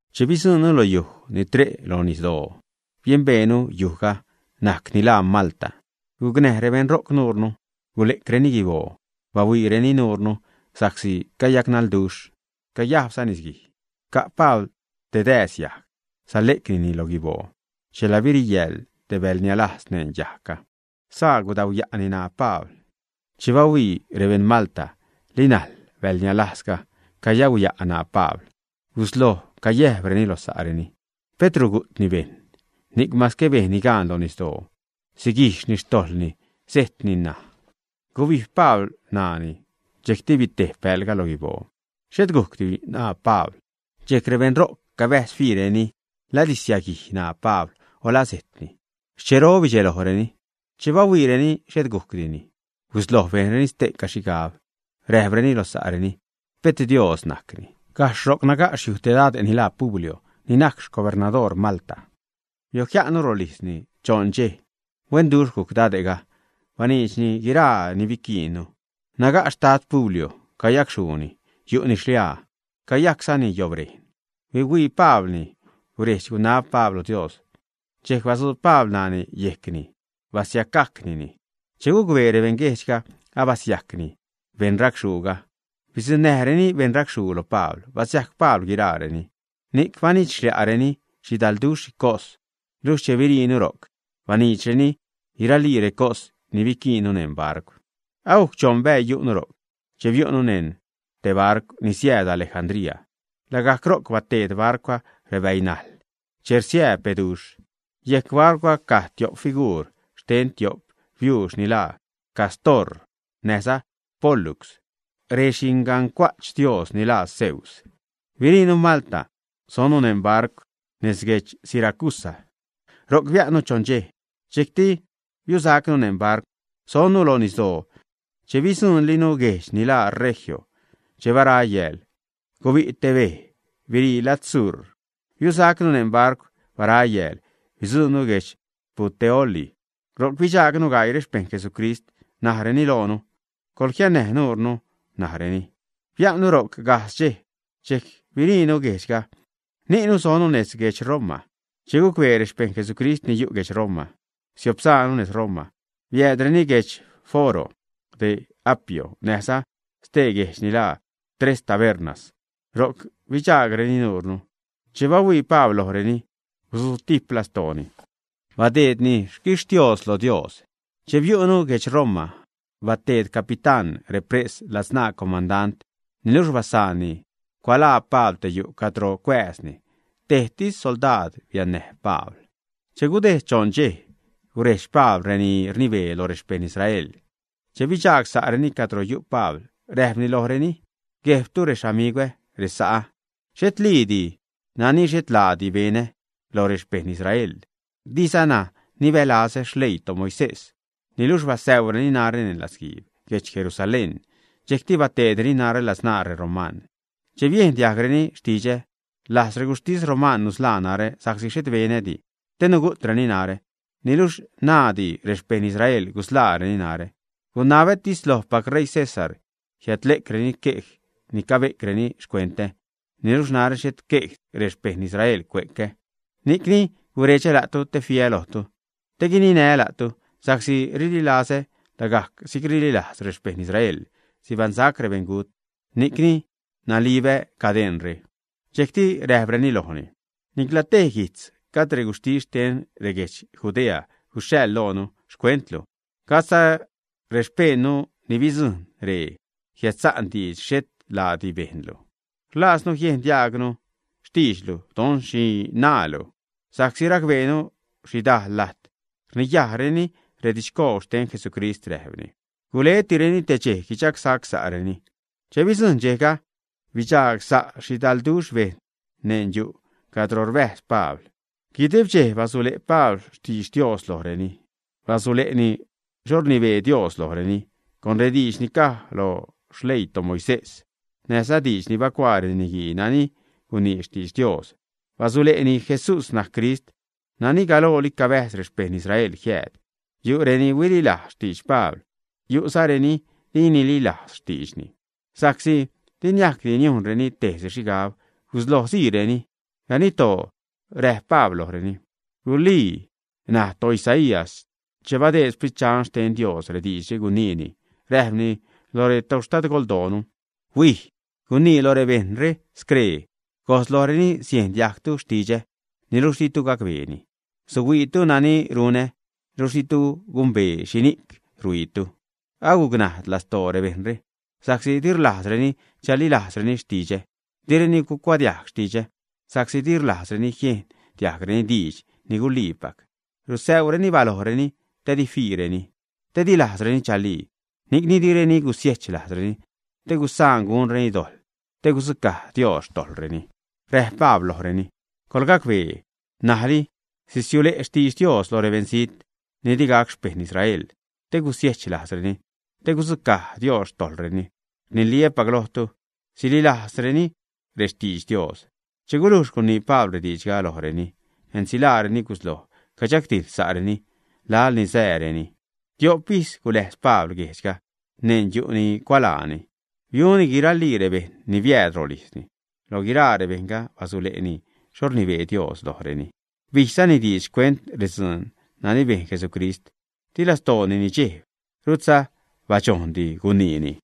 Che bidzujṉnu lo yuj ni tre' lo nisdoo, biembeenu yujga najc ni laa Malta. Gucnäj rebejṉ ro'c nuure, gule'creni guiboo bahuiireni nuure sa'csi cayacnaḻduxh, cayajbza nisguij. Ca' Pabl te dääz yajg, sale'cnini lo guiboo, chela biriyäḻ te bäḻ nialajz neṉ yajgga. Saa gudauya'ni ṉaa Pabl. Che bahuii rebeṉ Malta li najl bäḻ nialajzga cayauya' ṉaa Pabl, gusloj cayäjbreni lo sa'reni: ―Pet rugu'tni bejṉ ni'c mase bejnni gaan lo nisdoo siguijxni xtojḻni, sejtni ṉaj. Gubijb Pabl ṉaani dxejcti bitejb bäḻga lo guiboo. Xhet gujcdi ṉaa Pabl. Dxejc rebeṉ ro'c cabäjz fiireni la sisiäguij ṉaa Pabl o laa sejtni. Xchero bidxelojreni. Che bahuiireni xhet gujcdini, gusloj bejnreni ste'ca xhigab, räjpreni lo sa'reni: ―Pet dios najcni. Gajxh ro'c naga' xyuj te dade' ni laa Publio ni najc xcubernadoor Malta. Biojia'nnu rolijzni choṉ dxej. Huenduxh gujc dade'ga, baniidxni guiraa ni biquiinnu. Naga' xtad Publio cayacxhuuni, yu'ni xliaa, cayajczani yobrejn. Huihuii Pablni. Guredx-gunab Pabl lo Dios, dxejc batzuub Pabl ṉaani yejcni, basiacgajcnini. Che gucbee rebeṉguejdxga abasiajcni beṉ racxhuuga, bidzuṉnäjreni beṉ racxhuu lo Pabl, basiajc Pabl guiraareni. Ni'c banidx-xliaareni xhidalduxh xhicos, luxh che biriinu ro'c, baniidxreni guiralii recos ni biquiinnu neṉ barcw. Agujc choṉ bäii yu'nu ro'c che biu'nu neṉ te barcw ni siääd Alejandría. Lagajc ro'c bateed barcwga rebäinajḻ che rsiäb beduxh. Yejc barcwga caj tiop figuur xten tiop biuux ni laa Cástor näjza Pólux, rexingancua'ch dios ni laa Zeus. Biriinu Malta sonnu neṉ barcw nez guedx Siracusa. Ro'c bia'nnu choṉ dxej. Dxejcti biusacnu neṉ barcw, sonnu lo nisdoo cheni bidzuṉlinu guejdx ni laa Regio. Che bara yääl, gubi' te bej birii lad sur. Biusacnu neṉ barcw. Bara yääl bidzuṉnu guedx Puteoli. Ro'c bidxaagnu gaii xpejṉ Jesucrist. Najreni loonu: ―Coḻjiannäj nuunu ―najreni. Bia'nnu ro'c gajdz dxej. Dxejc biriinu guejdxga, ni'nu sonnu nez guedx Roma. Che gucbee rexpejṉ Jesucrist ni yu' guedx Roma siopsaanu nez Roma, biäädreni guedx Foro de Apio näjza stee guejdx ni laa Tres Tabernas, ro'c bidxaagreni nuure. Che bahuii Pabl lojreni, guzutijp lastooni, badeedni xquixtios lo Dios. Che biu'nu guedx Roma, bateed capitán repres ladzṉaa comandant, niluxh basaanni cualaa Pabl te yu' cadro cuääzni. Tejtis soldaad biannäj Pabl. Che gudejd choṉ dxej, gurejdx Pabl reni rnibee lo rexpejṉ Israel. Che bidxaag sa'reni cadro yu' Pabl, räjpni lojreni: ―Guejbtu rexamigwä, resa'ä, xhetliidi nani xhet laadi benä lo rexpejṉ Israel, dizana nibälazä xleii toMoisés. Niluxh basäureni narä neṉ latzguiib guedx Jerusalén, dxejcti bateedreni narä ladzṉaa reroman. Che biejn diajgreni xtidxä, rlajz reguxhtis roman nusḻaa narä sa'csi xhet benädi te nugu'treni narä. Niluxh naaddi rexpejṉ Israel gusḻaareni narä, gunabätis lojpac ṟeii César jiädle'creni quej ni cabe'creni xcuentä. Niluxh narä xhet xquejdi rexpejṉ Israel cue'cä. Ni'cni guredxä la'tu te fiä lojtu, te guininää́ la'tu, sa'csi rililazä lagajc si'c rililajz xpejṉ Israel sibaṉsac rebeṉgut, ni'c nalibä cadeṉre. Dxejcti räjpreni lojni: ―Nicla tej guijtz gajd reguxhtis xten reguedx Judea guxhaḻ loonu xcuentlu, gajdza rexpejṉnu ni bidzujṉ ree jiädsa'n diidx xhet laadi bejnlu. Rlajznu jiejn diajgnu xtiidxlu, don xhi naalu, sa'csi racbeenu xhidajl lajt rniyajreni redidxcoob xten Jesucrist ―räjpreni. Guletireni te dxej guidxagsa'reni. Che bidzujṉ dxejga, bidxagsa' xhidalduxh bejṉ neṉ yu' cadro rbäjz Pabl. Guideb dxej basule' Pabl xtidx Dios lojreni. Basule'ni xho rnibee Dios lojreni. Con rediidx ni caj lo xleii toMoisés näjza diidx ni bacuaa reniguii nani gunii xtidx Dios basule'ni Jesús najc Crist nani galooli cabäjz rebeṉ Israel jiääd. Yu' reni huililajz xtidx Pabl, yu'za reni di nililajz xtiidxni. Sa'csi di niajcdi niujnreni tejsi xhigab gusloj siireni. Ganiddoo räjp Pabl lojreni: ―Guliica naj toIsaías che badeed Sprit Dxan xten Dios rediidxre guniini, räjpni lo rextadgoldoonu: Huij, gunii lo rebejṉre, scree gojz lojreni: Siejn diajgtu xtidxä, niluxh ditu gacbeeni. Suhuiitu nani runä luxh ditu gumbee xhini'c ruhuiitu. Agucnajd lastoo rebejṉre sa'csi di rlajzreni chalilajzreni xtidxä. Direni cuadiajg xtidxä sa'csi di rlajzreni jiejn diajgreni diidx ni guliipac. Rusäuzareni balojreni te di fiireni, te di lajzreni chalii. Ni'cni direni gusiechlajzreni te gusaan gunreni dojḻ te gudzucaj Dios xtojḻreni. Räjp Pabl lojreni: ―Coḻgacbee. N̲ajli sisiule' xtidx Dios lo rebeṉzijt ni di gac xpejṉ Israel te gusiejch lajzreni, te gudzucaj Dios xtojḻreni. Rniliä́pac lojtu, sililajzreni rextidx Dios. Che gulujx gunii Pabl rediidxga lojreni, ensilaareni gusloj cadxagdijḻ sa'reni laḻ ni sääreni. Tiop ijz guläjz Pabl guejdxga neṉ yu' ni cualaani. Biuni guiralii rebejṉ ni biääd rolijzni. Lo guiraa rebejṉga basule'ni xho rnibee Dios lojreni. Bijzani diidx xcuent redzuun nani bejn Jesucrist. Di lastooni nidxejb, rutza badxojndi guniini.